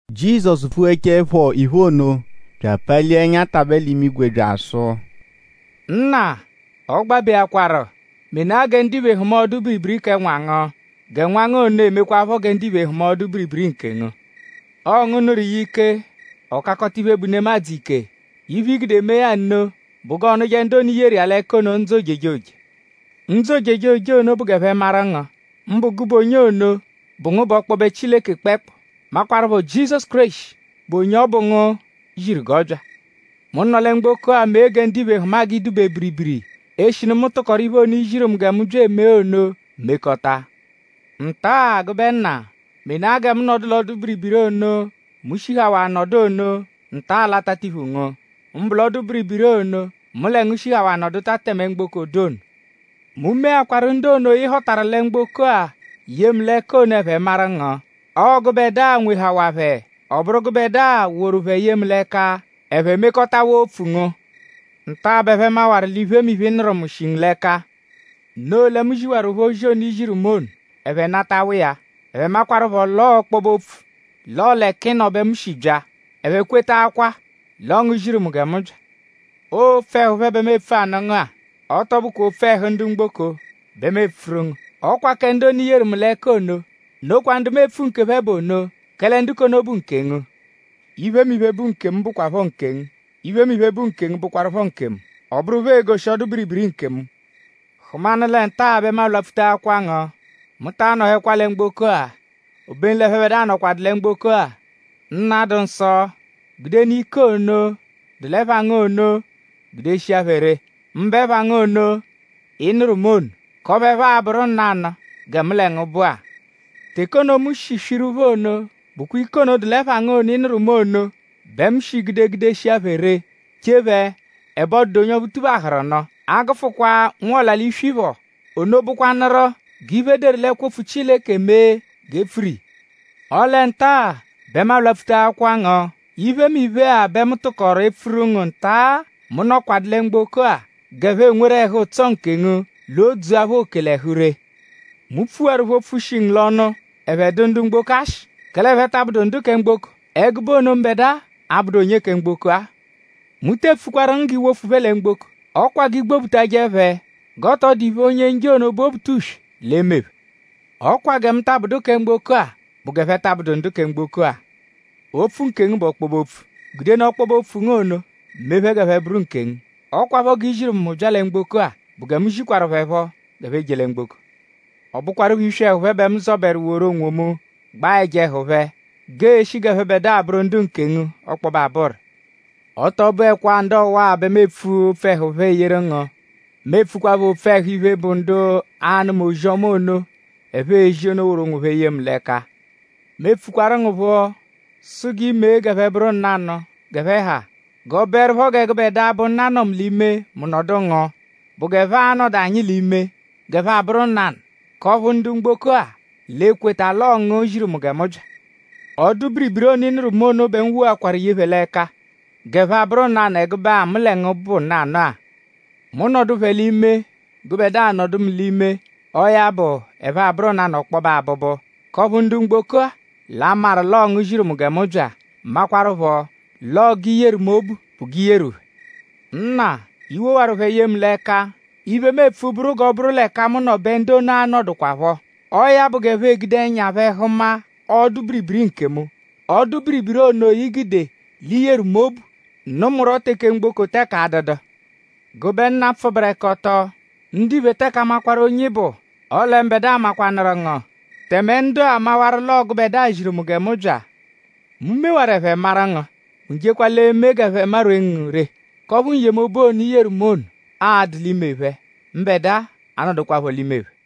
Jizọsu pfughechaẹpho iphe ono bya apalia ẹnya tabẹ l'imigwe bya asụ: “Nna; ọ gbabeakwaru; menaa gẹ ndiphe hụma ọdu-biribiri kẹ Nwa ngu; gẹ Nwa ngu ono emekwaaphọ gẹ ndiphe hụma ọdu-biribiri nkengu. Ọo ngu nụru iya ike; ọ kakọta iphe, bụ nemadzụ ike. Iphe, i gude mee ya nno bụ g'ọonuje ndu ono, i yeru iya l'ẹka ono ndzụ ojejoje. Ndzụ ojejoje ono bụ g'ẹphe maru ngu; mbụ gụbe onye ono, bụ ngu bụ ọkpobe Chileke kpẹekpu; makwaruphọ Jizọsu Kéreshi, bụ onye ọ bụ ngu ziru g'ọ bya. Mu nọ lẹ mgboko-a mee gẹ ndiphe hụma g'ị dụ-be biribiri; eshinu mu tụkoru iphe ono, i ziru mu gẹ mu bya emee ono mekọta. Nta-a; gụbe Nna; menaa gẹ mu nọdu l'ọdu-biribiri ono, mu shihawaa nọdu ono nta-a l'atatiphu ngu; mbụ l'ọdu-biribiri ono, mu lẹ ngu shihawaa nọduta tẹme mgboko dụ ono. “Mu meakwaru ndu ono, ị họtaru lẹ mgboko-a ye mu l'ẹka ono; ẹphe maru ngu. Ọo gụbedua nwehawaa phẹ; ọ bụru gụbedua woru phẹ ye mu l'ẹka; ẹphe mekọtawaa opfu ngu. Nta-a bẹ ẹphe mawaru l'iphemiphe, ị nụru mu shi ngu l'ẹka. Noo lẹ mu ziwaru phẹ ozi ono, i ziru mu ono; ẹphe natawa iya. Ẹphe makwaruphọ l'ọo ọkpobe-opfu l'ọo l'ẹka ị nọ bẹ mu shi bya; ẹphe kwetaakwaa l'ọo ngu ziru mu gẹ mu bya. “Ọo opfu ẹhu phẹ bẹ mu epfu anụ ngu-a. Ọ tọ bụkwa opfu ẹhu ndu mgboko bẹ mu epfuru ngu; ọ kwa kẹ ndu ono, i yeru mu l'ẹka ono; nokwa ndu mu epfu nkephẹ bụ ono; kẹle ndu k'ono bụ nkengu. Iphemiphe, bụ nkemu bụkwapho nkengu. Iphemiphe, bụ nkengu bụkwarupho nkemu. Ọ bụru phẹ egoshi ọdu-biribiri nkemu. Hụmanu lẹ nta-a bẹ mu alwapfutaakwa ngu. Mu ta anọhekwa lẹ mgboko-a; obenu l'ẹphebedua nọkwadu lẹ mgboko-a. Nna, dụ nsọ; gudenụ ike ono, dụ l'ẹpha ngu ono gudeshia phẹ ree; mbụ ẹpha ngu ono, ị nụru mu ono; k'ọphu ẹphe a-bụru nanụ gẹ mu lẹ ngu bụ-a. Teke ono, mu shi swiru phẹ ono bụkwa ike ono, dụ l'ẹpha ngu ono, ị nụru mu ono bẹ mu shi gude gudeshia phẹ ree; chee phẹ; ẹbe ọ dụdu onye ọphu tuphahụru nụ; a -gụfukwa nwa ọla-l'iswi phọ. Ono bụkwanuru g'iphe, e deru l'ẹkwo-opfu Chileke emee g'e pfuru iya. “Ọle nta-a bẹ mu alwapfutaakwa ngu. Iphemiphe-a bẹ mu tụkoru epfuru ngu nta-a, mu nọkwadu lẹ mgboko-a g'ẹphe enweru ẹhu-ụtso nkemu; l'o dzua phẹ oke l'ẹhu ree. Mu pfuwaru phẹ opfu, shi ngu l'ọnu; ẹphe dụ ndu mgboko ashị; kẹle ẹphe ta abụdu ndu kẹ mgboko; ẹgube ono, mbẹdua abụdu onye kẹ mgboko-a. Mu te epfukwaru ngu g'i wofu phẹ lẹ mgboko. Ọ kwa g'i gbobutajẹ phẹ g'ọ tọ dụ iphe, Onye-njọ ono, bụ Obutuswe l'e-me phẹ. Ọ kwa gẹ mu ta abụdu onye kẹ mgboko-a bụ g'ẹphe ta abụdu ndu kẹ mgboko-a. Opfu nkengu bụ ọkpobe-opfu. Gudenụ ọkpobe-opfu ngu ono mee phẹ g'ẹphe bụru nkengu. Ọ kwaphọ g'i ziru mu gẹ mu bya lẹ mgboko-a bụ gẹ mu zikwaru phẹ phọ g'ẹphe je lẹ mgboko. Ọ bụkwarupho iswi ẹhu phẹ bẹ mu zọberu woru onwomu gbaa ẹja ẹhu phẹ g'ee-shi g'ẹphebedua abụru ndu nkengu ọkpobe abụru. “Ọ tọ bụekwaa ndu ọwa-a bẹ mu epfu opfu ẹhu phẹ eyeru ngu; mu epfukwaphọ opfu ẹhu iphe, bụ ndu a-nụma ozi-ọma ono, ẹphe ezi ono; woru onwophẹ ye mu l'ẹka. Mu epfukwaru ngu phọ sụ g'i mee g'ẹphe bụru nanụ g'ẹphe ha. G'ọ bụerupho gẹ gụbedua, bụ Nna nọ mu l'ime; mu nọdu ngu; bụ g'ẹphe a-nọdu anyi l'ime; g'ẹphe abụru nanụ; k'ọphu ndu mgboko-a l'e-kweta l'ọo ngu ziru mu gẹ mu bya. Ọdu-biribiri ono, ị nụru mu ono bẹ mu woakwaru ye phẹ l'ẹka g'ẹphe abụru nanụ ẹgube-a, mu lẹ ngu bụ nanụ-a. Mu -nọdu phẹ l'ime; gụbedua -nọdu mu l'ime; ọo ya bụ; ẹphe abụru nanụ ọkpobe abụbu; k'ọphu ndu mgboko-a l'a-maru l'ọo ngu ziru mu gẹ mu bya; makwarụpho l'ọo g'i yeru mu obu bụ g'i yeru phẹ. “Nna; i wowaru phẹ ye mu l'ẹka. Iphe, mu epfu bụru g'ọ bụru l'ẹka mu nọ bẹ ndu ono a-nọdukwapho. Ọo ya bụ g'ẹphe egude ẹnya phẹ hụma ọdu-biribiri nkemu; ọdu-biribiri ono, i gude l'i yeru mu obu nụ mu rọ teke mgboko teke adụdu. Gụbe Nna, pfụberekoto; ndiphe teke amakwaru onye ị bụ; ọle mbẹdua makwanụru ngu; tẹme ndu-a mawaru l'ọo gụbedua ziru mu gẹ mu bya. Mu mewaru; ẹphe mawaru ngu; mu jekwa l'e-me g'ẹphe marwee ngu ree; k'ọphu n-yemobu ono, i yeru mu ono a-dụ l'ime phẹ; mbẹdua anọdukwapho l'ime phẹ.”